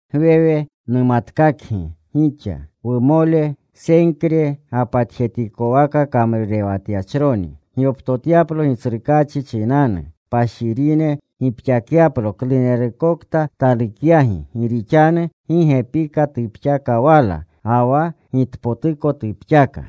Gwewe numatkakgi gixa, wumole, Senkre gapatjetikowaka kamrurewatyachroni, gyoptotyaplo Gitsrukaachi chinanu, kpashirine kgimuka; gipxakyaplo klunerukokta talukyagi. Gi rixanu gi gepika tupxaka wala, ga wa gitpotuko tupxaka.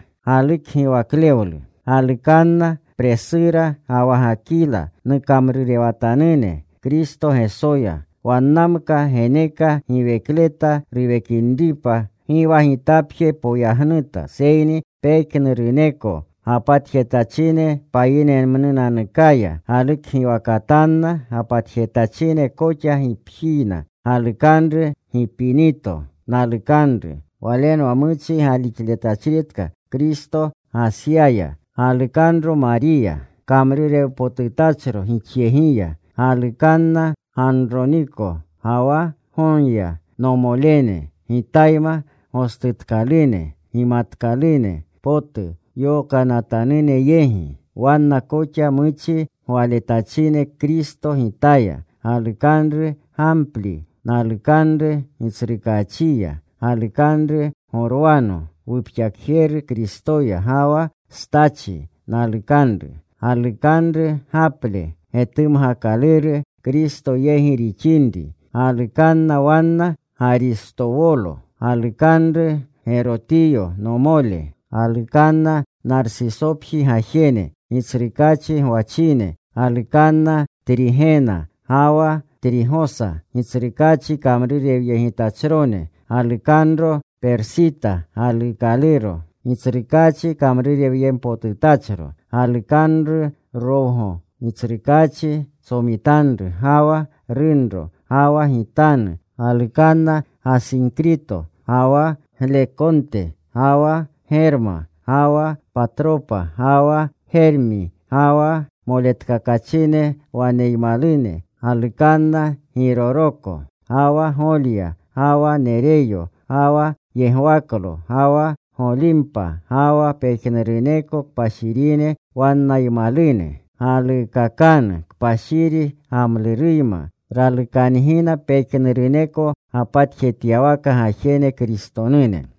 Galukanna Presura, ga wa Gakila nukamrurewatanune Kristo Gesoya. Wannamka geneka giwekleta nuwekinripa. Gi wa gitapje poyagnutna, seyni pejnuruneko gapatjetachine payinemnunanukaya. Galukgiwakatanna gapatjetachine koxa gipjiyna. Galukanru Gipinito, nalukanru. Walenwa muchi galixletachritka Kristo Gasyaya. Galukanro Mariya, kamrurewpotutachro gixyegiya. Galukanna Ganroniko ga wa Gonya, nomolene, gitayma gostujenatkalune gimatkalune potu yokanatanune yegi. Wanna koxa muchi gwayegletachine Kristo gitaya. Galukanru Gampli, nalukanru Gitsrukaachiya. Galukanru Gorwano, wupxakjeru Kristoya, ga wa Stachi, nalukanru. Galukanru Gaple, getumgakaluru Kristo yegi rixinri. Galukanna wanna Garistowolo. Galukanru Gerotiyo nomole. Galukanna Narsisopji gajene, Gitsrukaachi gwachine. Galukanna Trigena ga wa Trigosa, Gitsrukaachi kamrurewyegitachrone. Galukanro Persita galuukaluro, Gitsrukaachi kamrurewyempotutachro. Galukanru Rogwo, Gitsrukaachi tsomitanru, ga wa runro, ga wa gitanu. Galukanna Gasinkrito, ga wa Glekonte, ga wa Germa, ga wa Patropa ga wa Germi, ga wa moletkakachine wannaymalune. Galukanna Giroroko, ga wa Golya, ga wa Nereyo, ga wa yegwaklo, ga wa Golimpa, ga wa pejnuruneko kpashirine wannaymalune. Galuukakanu kpashiri gamluruyma. Ralukangina pejnuruneko gapatjetyawaka gajene Kristonune.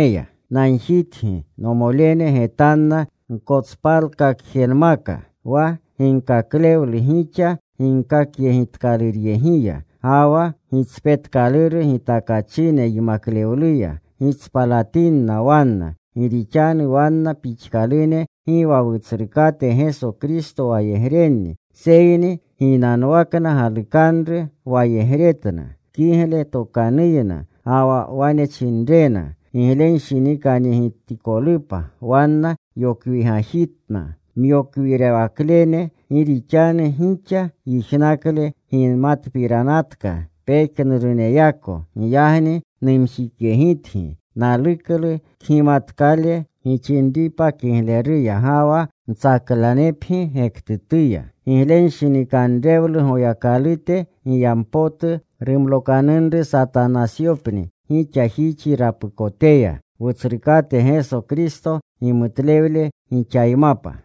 Nagjitgi, nomolene, getanna gkotspalkakjenemka wa ginkaklewlu gixa ginkakyegitkaluryegiya, ga wa gitspetkaluru gitakachine yimaklewluya. Gitspalatinna wanna. Gi rixanu wanna pixkalune gi wa Wutsrukate Geso Kristo wayegrenni, seyni ginanwakna galukanru wayegretna. Kigle tokanuyna, ga wa wane chinrena giglenshinikanyegitikolupa, wanna yokwigajitna myokwirewaklene. Gi rixanu gixa yijnakle gimatpiranatka pejnuruneyako. Giyagni numjikyegitgi. Naluklu kgimatkale gixinripa kigleruya, ga wa mtsaklanepgi gektutuya. Giglenshinikanrewlu Goyakalute giyampotu rumlokanunru Satanasyopni gixajixi rapukoteya. Wutsrukate Geso Kristo gimutlewle gixaymapa.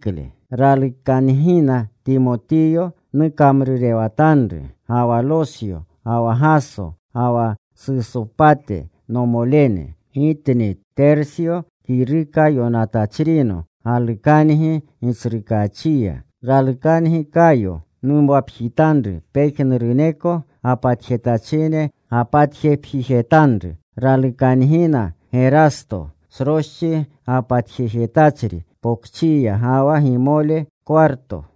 Ralukangina Timoteyo nukamrurewatanru, ga wa Losyo, ga wa Gaso, ga wa Sosupate, nomolene. Gitni, Tersyo, kiruka yonatachrino, galukangi Gitsrukaachiya. Ralukangi, Kayo numwapjitanru, pejnuruneko gapatjetachine gapatjepjijetanru. Ralukangina Gerasto, sroschi gapatjejetachri pokchiya, ga wa gimole Kwarto.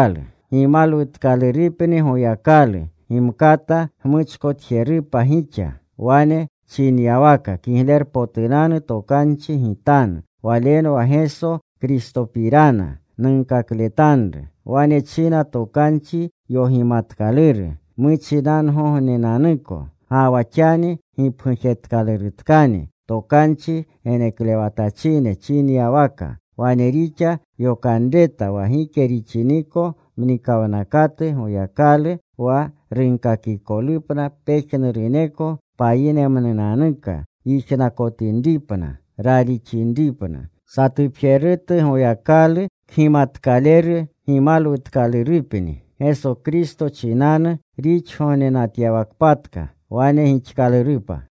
Gimalwutkalurupni Goyakalu, gimkata gmuchkotjerupa gixa, wane chinyawaka Kiglerpotunanu Tokanchi gitanu. Walenwa Geso Kristopirana nunkakletanru. Wane china tokanchi yogimanatkaluru muchikawgognenanuko. Ga wa xani gipgujetkalurutkani tokanchi geneklewatachine chinyawaka. Wane rixa yokanreta wa gike rixiniko mnikawnakotu Goyakalu, wa runkakikolupna pejnuruneko payinemnunanuka yijnakotinripna; ralixinripna. Satupjerutu Goyakalu kgimatkaleru gimalwutkalurupni Gesokristo chinanu rixgognenatyawakpatka. Wane gixkalurupa.